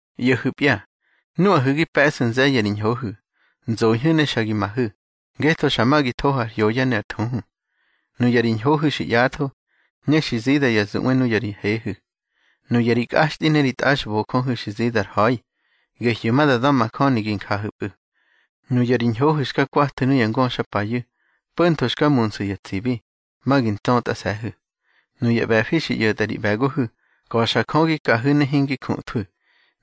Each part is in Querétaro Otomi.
ꞌYo̱hu̱pya, nuꞌahu̱ gi pe̱ꞌsu̱ nze̱ye̱ ri ñhohu̱, nzoñhu̱ ne xa gi mahu̱, ngetho xa ma gi thohu̱ ar hyoya ne ar thuhu. Nuya ri ñhohu̱ xi ꞌyatho, ne xi zida ya zuꞌwe nuya ri hehu̱. Nuya ri kꞌaxtꞌi ne ri tꞌaxbojöhu̱ xi zida ar ha̱i, gehyu̱ ma da da̱majöni gi njahu̱pꞌu̱. Nuya ri ñhohu̱ xka kwathu̱ nuya ngöxapayu̱, po̱ntho xka munsu̱ ya tsibi, ma gi ntsötꞌase̱hu̱. Nuya ꞌbe̱fi xi ꞌyo̱tꞌa ri ꞌbe̱gohu̱, ka̱xa Jö gi kahu̱ ne hingi juthwu̱.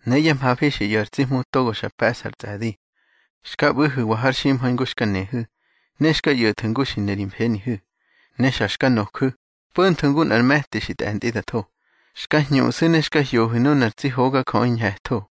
Ne yá mhafi xi ꞌyo̱ ar tsi Hmu togo xa pe̱ꞌsa ar tsꞌe̱di. Xka ꞌbu̱hu̱wa har ximha̱i ngu xka nehu̱, ne xka ꞌyo̱thu̱ ngu xi ne ri mfenihu̱. Ne xa xka noju̱, po̱ntho ngu nꞌar me̱ti xi tꞌe̱ntꞌi da tho. Xka hñuꞌsu̱ ne xka hyohu̱ nunar tsi hogajöꞌi ñhe̱tho.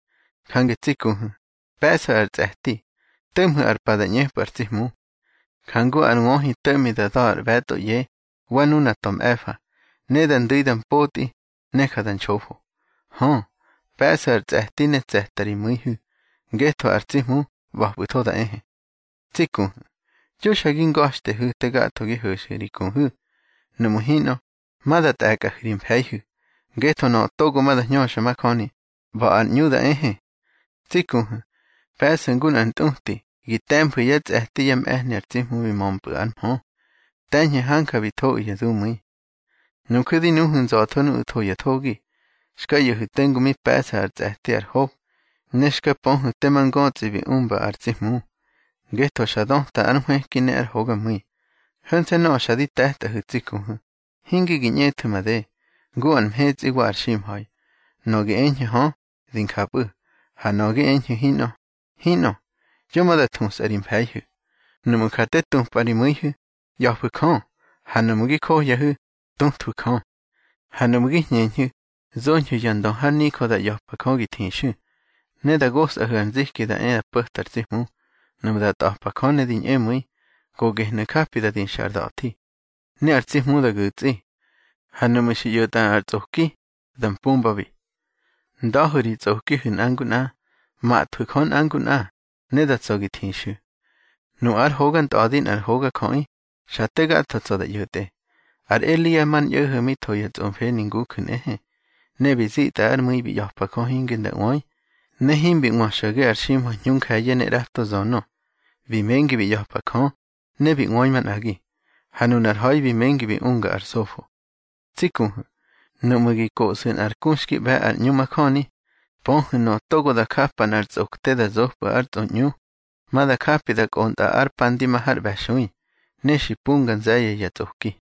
Jange tsi kuhu̱, pe̱ꞌsu̱ ar tsꞌe̱ti, to̱ꞌmhu̱ ar pa da ꞌñepꞌu̱ ar tsi Hmu. Jangu ar wöhi to̱ꞌmi da da̱ ar ꞌbe̱tꞌo ꞌye, wa nuna ta̱ mꞌe̱fa, ne da ndu̱i da mpotꞌi, ne ja da nxofo. Hö, pe̱ꞌsu̱ ar tsꞌe̱ti ne tse̱ta ri mu̱ihu̱, ngetho ar tsi Hmu ꞌba̱pꞌu̱tho da ehe. Tsi kuhu̱, yo xa gi nga̱xtehu̱ te gatho gi ho̱xu̱ ri kuhu̱. Nuꞌmu̱ hinꞌö, ma da tꞌe̱kꞌahu̱ ri mfe̱ihu̱, ngetho nöꞌö togo ma da hñöxa majöni, ꞌba̱ ar ꞌñu da ehe. Tsi kuhu̱, pe̱ꞌsu̱ ngu nꞌar ntꞌuti gi te̱mfu̱ yá tsꞌe̱ti yá mꞌe̱hni ar tsi Hmu bi mömpꞌu̱ ár mhö. Te̱ñhu̱ hanja bi thoꞌu̱ ya dumu̱i. Nuju̱ di nuhu̱ nza̱tho nuꞌu̱ tho ya thogi. Xka ꞌyo̱hu̱ tengu mi pe̱ꞌsa ar tsꞌe̱ti ar Hob, ne xka pöhu̱ tema ngötsꞌi bi umba ar tsi Hmu, ngetho xa döta ár nhwëki ne ár hogamu̱i. Ho̱nse̱ nöꞌö xa di te̱tꞌahu̱ tsi kuhu̱, hinte gi ꞌñethu̱ made, ngu ar mhetsꞌi wa ar ximha̱i. Nöꞌö gi eñhu̱ hö, di njapꞌu̱, ha nöꞌö gi eñhu̱ hinꞌö, hinꞌö. Yo ma da thusꞌa ri mfe̱ihu̱. Nuꞌmu̱ ja te tupꞌa ri mu̱ihu̱, ꞌya̱fu̱ Jö. Ha nuꞌmu̱ gi johyahu̱, tuthwu̱ Jö. Ha nuꞌmu̱ gi hñeñhu̱, zoñhu̱ ya ndö har nijö da ꞌya̱pa Jö gi thixu̱, ne da gosꞌahu̱ ar nziki da e po̱ta ar tsi Hmu. Nuꞌmu̱ da tꞌa̱pa Jö ne di ñꞌemu̱i, go gehnu̱ japi da dixa ar da̱thi, ne ar tsi Hmu da gu̱tsꞌi. Ha nuꞌmu̱ xi ꞌyo̱tꞌa nꞌar tsꞌoki, da mpumbabi. Nda̱hu̱ ri tsꞌokihu̱ nꞌa ngu nꞌa, mhathwu̱ Jö nꞌa ngu nꞌa, ne da tsa̱ gi thixu̱. Nu ár hoga ntꞌa̱di nꞌar hogajöꞌi, xa te gatho tsa̱ da ꞌyo̱tꞌe. Ar Elia mar ñꞌo̱ho̱ mi tho ya tsꞌomfeni nguju̱ nꞌehe. Ne bi zitꞌa ár mu̱i bi ꞌya̱pa Jö hinge nda ꞌwöi, ne himbi ꞌwö xo̱ge ar ximha̱i hñu nje̱ye̱ ne ꞌrato nzönö. Bi mengi bi ꞌya̱pa Jö, ne bi ꞌwöi manꞌagi, ha nunar ha̱i bi mengi bi unga ár sofo. Tsi kuhu̱, nuꞌmu̱ gi koꞌsu̱ nꞌar ku xki ꞌbe̱ ar ꞌñu majöni, pöhu̱ nöꞌö togo da japa nꞌar tsꞌokte da zopꞌu̱ ár tsꞌoꞌñu, ma da japi da kꞌontꞌa ár pa ndi ma har ꞌbe̱xui, ne xi mpunga nze̱ye̱ ya tsꞌoki.